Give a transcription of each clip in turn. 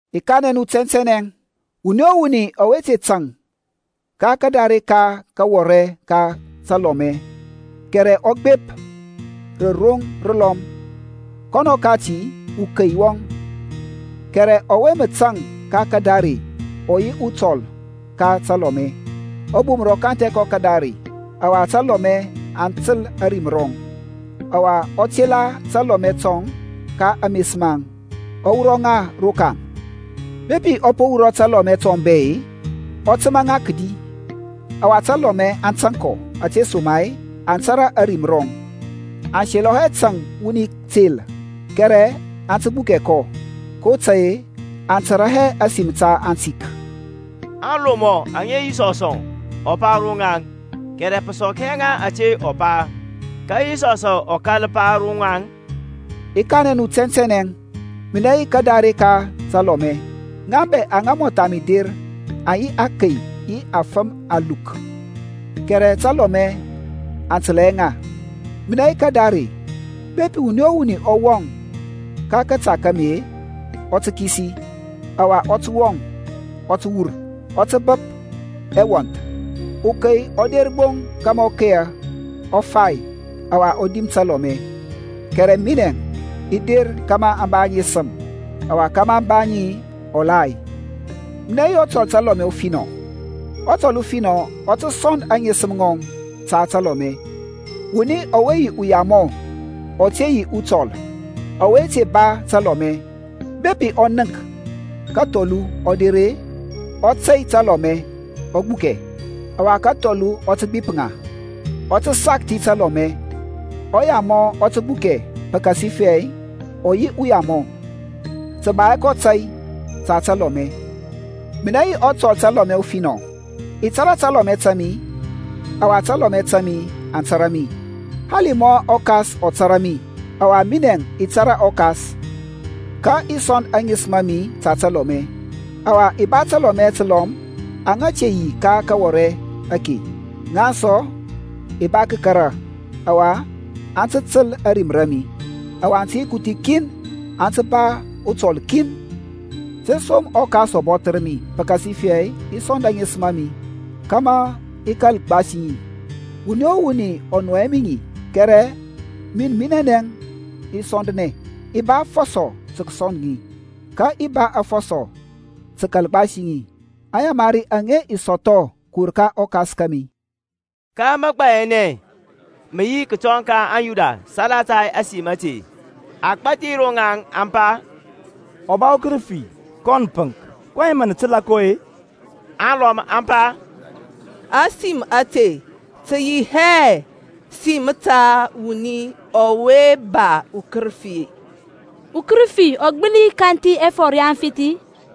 I kanɛ nu tɛntɛnɛ, Wuni o wuni ɔwe te tȧŋ ka kadare ka kawɔrɛ ka talɔmɛ, kɛrɛ ɔ gbep ri rə roŋ dəlɔm, kɔnɔ kati ukei wɔŋ. Kɛrɛ ɔwe mə tȧŋ ka kadare ɔ yi ɔtɔl ka talɔmɛ. Ɔbumər ɔ kanthɛ kɔ kadare; ɔwa talɔmɛ aŋ təl ȧrim rɔŋ, ɔwa ɔ tela talɔmɛ tɔŋ ka ames maŋ, ɔ wurɔ ŋa rokaŋ. Bepi ɔ po wurɔ talɔmɛ tɔŋ bɛ-e, ɔ təmȧ ŋa kədi, ɔwa talɔmɛ aŋ tȧŋ kɔ; ȧtesoma-e aŋ tȧrȧ ȧrim rɔŋ. Aŋ selɔ hɛ tȧŋ wuni tel, kɛrɛ aŋ tə gbukɛ kɔ, kotȧy-e aŋ tȧrȧ hɛ ȧsim ta atik. Aŋlomɔ aŋe Yisɔsȧŋ ɔ pa ro ŋaŋ; kɛrɛ pə sɔk hɛ ŋa ȧte ɔ pa. Ka Yisɔsȧŋ ɔ kȧl pa ro ŋaŋ, I kanɛ nu tɛntɛnɛ, Minɛ yi kadare ka talɔmɛ. Ŋa bɛ aŋa mɔtha mi der aŋ yi akey yi afəm aluk kɛrɛ talɔmɛ aŋ təlȧ hɛ ŋa. Minɛ yi kadare: bepi wuni o wuni ɔ wɔŋ ka kȧta ka mi-e, ɔ tə kisi, ɔwa ɔ tə wɔŋ, ɔ tə wur, ɔ tə bəp ɛwɔnth. Ukey ɔ der gbo kȧmȧ ɔ keya, ɔ fai, ɔwa ɔ dim talɔmɛ: minɛ i der kȧmȧ aŋ ba aŋesəm, ɔwa kȧmȧ aŋ ba ŋi ɔlay. Minɛ yi ɔtɔl təlɔmɛ ufinɔ: ɔtɔl ufinɔ ɔ tə sɔnd aŋesəm ŋɔŋ ta talɔmɛ. Wuni ɔwe yi uyamɔ, ɔ te yi ɔtɔl, ɔwe te ba talɔmɛ, bepi ɔ nənk kathɔlu ɔ der-e, ɔ tey talɔmɛ, ɔ gbukɛ: ɔwa kathɔlu ɔ tə gbip ŋa, ɔ tə sakthi talɔmɛ. Ɔyamɔ ɔ tə gbukɛ, pəkasifɛ ɔ yi uyamɔ, tə ba hɛ kɔ tȧy ta talɔmɛ. Minɛ yi ɔtɔl talɔmɛ ufinɔ, i tȧrȧ talɔmɛ ta mi, ɔwa talɔmɛ ta mi aŋ tȧrȧ mi, hali mɔ ɔKas ɔ tȧrȧ mi, ɔwa minɛ i tȧrȧ ɔKas; ka i sɔnd aŋesəm a mi ta talɔmɛ. Ɔwa i ba təlɔmɛ təlɔm, aŋa te yi ka kawɔrɛ ake: ŋaŋ sɔ i ba kəkara, ɔwa aŋ tə təl ȧrim ra mi: ɔwa aŋ tə yi kuthi kin, aŋ tə ba ɔtɔl kin. Tȧsom ɔKas ɔ bɔthər mi, pəkasifɛ i sɔnd aŋesəm a mi, kȧmȧ i kȧl gbasi ŋi. Wuni o wuni ɔ nɔy hɛ mi ŋi, kɛrɛ min minɛnɛ i sɔndnɛ. I ba afɔsɔ tə kəsɔnd ŋi, ka i ba afɔsɔ tə kəkal gbasi ŋi. Aŋyamari aŋe i sɔthɔ kəwur ka ɔKas kȧmi. Ka məgbayanɛ mə yi kətɔŋ ka aŋYuda salata ȧsim ȧte. Agbȧthi rɔŋaŋ aŋ pa, Ɔ ba ukərəfi, kɔn pəŋk: kɔyɛŋ mə nə təlȧ kɔ-e? Alɔm aŋ pa, Ȧsim ȧte tə yi hɛ sim ta wuni ɔwe ba ukərəfi. Ukərəfi ɔ gbəli kanthi ɛfɔr ya aŋfith-i?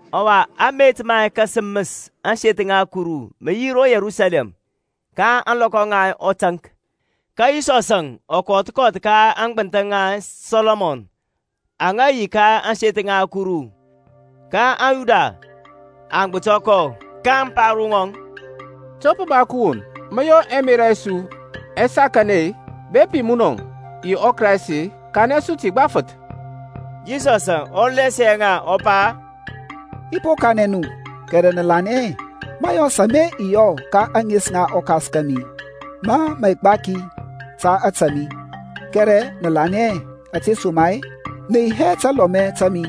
Ɔwa amet ma kasəməs ȧŋseth ŋa Kuru mə yi ro Yerusalɛm ka ȧŋlɔkɔ ŋa ɔtaŋk. Ka Yisɔsȧŋ ɔ kɔth kɔth ka aŋgbənthəŋ ŋa Sɔlɔmɔn aŋa yi ka ȧŋseth ŋa Kuru. Ka aŋYuda aŋ gbətɔ kɔ, kaŋ pa ro ŋɔŋ, To pə ba kəwon mə yɔ ɛmerȧ ɛ su ɛ sɔkanɛ-e? Bepi munɔ yi ɔKraist-e, kanɛ su ti gbafəth. Yisɔsȧŋ ɔ lasia ŋa, ɔ pa, I po kanɛ nu, kɛrɛ nə lanɛ hɛ: mȧyɔs ama i yɔ ka ȧŋes ŋa ɔKas kȧmi, mȧ mə gbaki ta ȧtȧ mi. Kɛrɛ nə lanɛ hɛ, ȧtesoma-e nə yi hɛ talɔmɛ ta mi.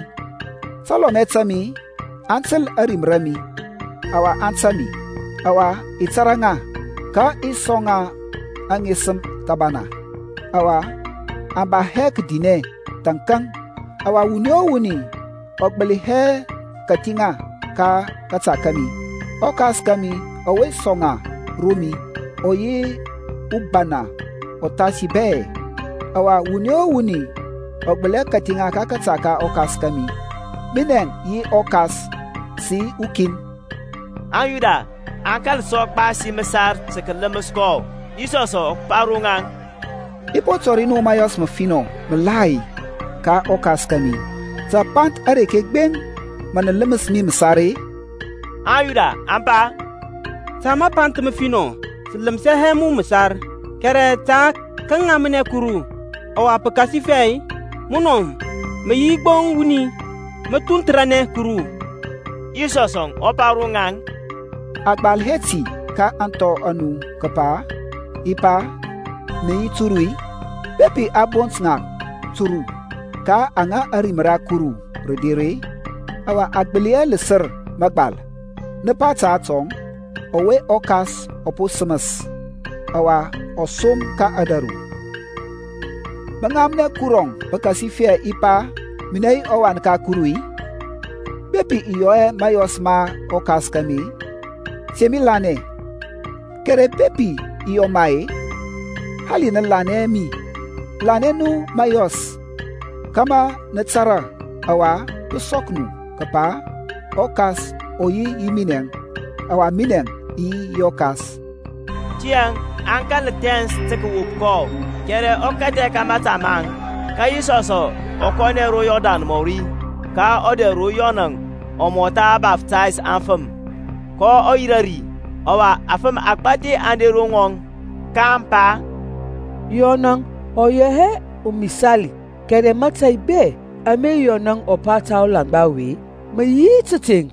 Talɔmɛ ta mi aŋ təl ȧrim ra mi, ɔwa aŋ tȧŋ mi, ɔwa i tȧrȧ ŋa: ka i sɔŋ ŋa aŋesəm thəbana; ɔwa aŋ ba hɛ kədinɛ thȧnkȧŋ, ɔwa wuni o wuni ɔ gbəli hɛ kathi ŋa ka kȧta kȧmi. ƆKas kȧmi ɔwe sɔŋ ŋa ro mi, ɔ yi ubana uthasi bɛ; ɔwa wuni o wuni ɔ gbəli hɛ kathi ŋa ka kȧta ka ɔKas kȧmi. Minɛŋ yi ɔKas sə yi ukin. AŋYuda aŋ kȧl sɔ gbasi məsar tə kələməs kɔ. Yisɔsȧŋ ɔ pa ro ŋaŋ, I po tɔri nu məyɔs məfinɔ məlai ka ɔKas kȧmi; ta apanth areke gbeŋ mə nə ləməs mi məsar-e? AŋYuda aŋ pa, Ta apanth afinɔ sə ləməs hɛ mu məsar, kɛrɛ ta kəŋamnɛ Kuru: ɔwa pəkasifɛ munɔ ma mə yi gbo wuni, mə thunthəranɛ Kuru. Yisɔsȧŋ ɔ pa ro ŋaŋ, A gbal hɛ ti ka ȧŋthɔ a nu kəpa, I pa, nə yi turu-i? Bepi ɔ bont ŋa turu, ka aŋa ȧrim ra Kuru rə der-e, ɔwa a gbəli hɛ ləsər mȧgbal; nə pa ta atɔŋ, ɔwe ɔKas ɔ po səməs, ɔwa ɔ som ka ȧdȧru, Mə ŋamnɛ Kurɔŋ, pəkasifɛ i pa, Minɛ yi ɔWan ka Kuru-i? Bepi i yɔ hɛ mȧyɔs ma ɔKas kȧmi, te mi lanɛ. Kɛrɛ bepi i yɔ ma-e, hali nə lanɛ hɛ mi, lanɛ nu mȧyɔs: kȧmȧ nə tȧrȧ, ɔwa pə sɔk nu, kəpa ɔKas ɔ yi yi minɛŋ, ɔwa minɛŋ i yi yi ɔKas Tiyȧŋ aŋ kȧl thɛns tə kəwop kɔ; kɛrɛ ɔ kathɛ ka mȧta maŋ. Ka Yisɔsȧŋ ɔ kɔnɛ sɔ ro Yɔrdan mɔri ka ɔdɛr ro Yɔnȧŋ ɔ mɔtha baftays afəm, kɔ yirȧ ri. Ɔwa afəm agbȧthi aŋ der ro ŋɔŋ, kaŋ pa, Yɔnȧŋ ɔ yɔ hɛ amisali, kɛrɛ mȧtȧy bɛ ama Yɔnȧŋ ɔ pa ta ɔlaŋgba ɔwe mə yi tȧteŋ.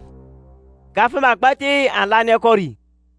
Ka afəm agbȧthi aŋ lanɛ kɔ ri.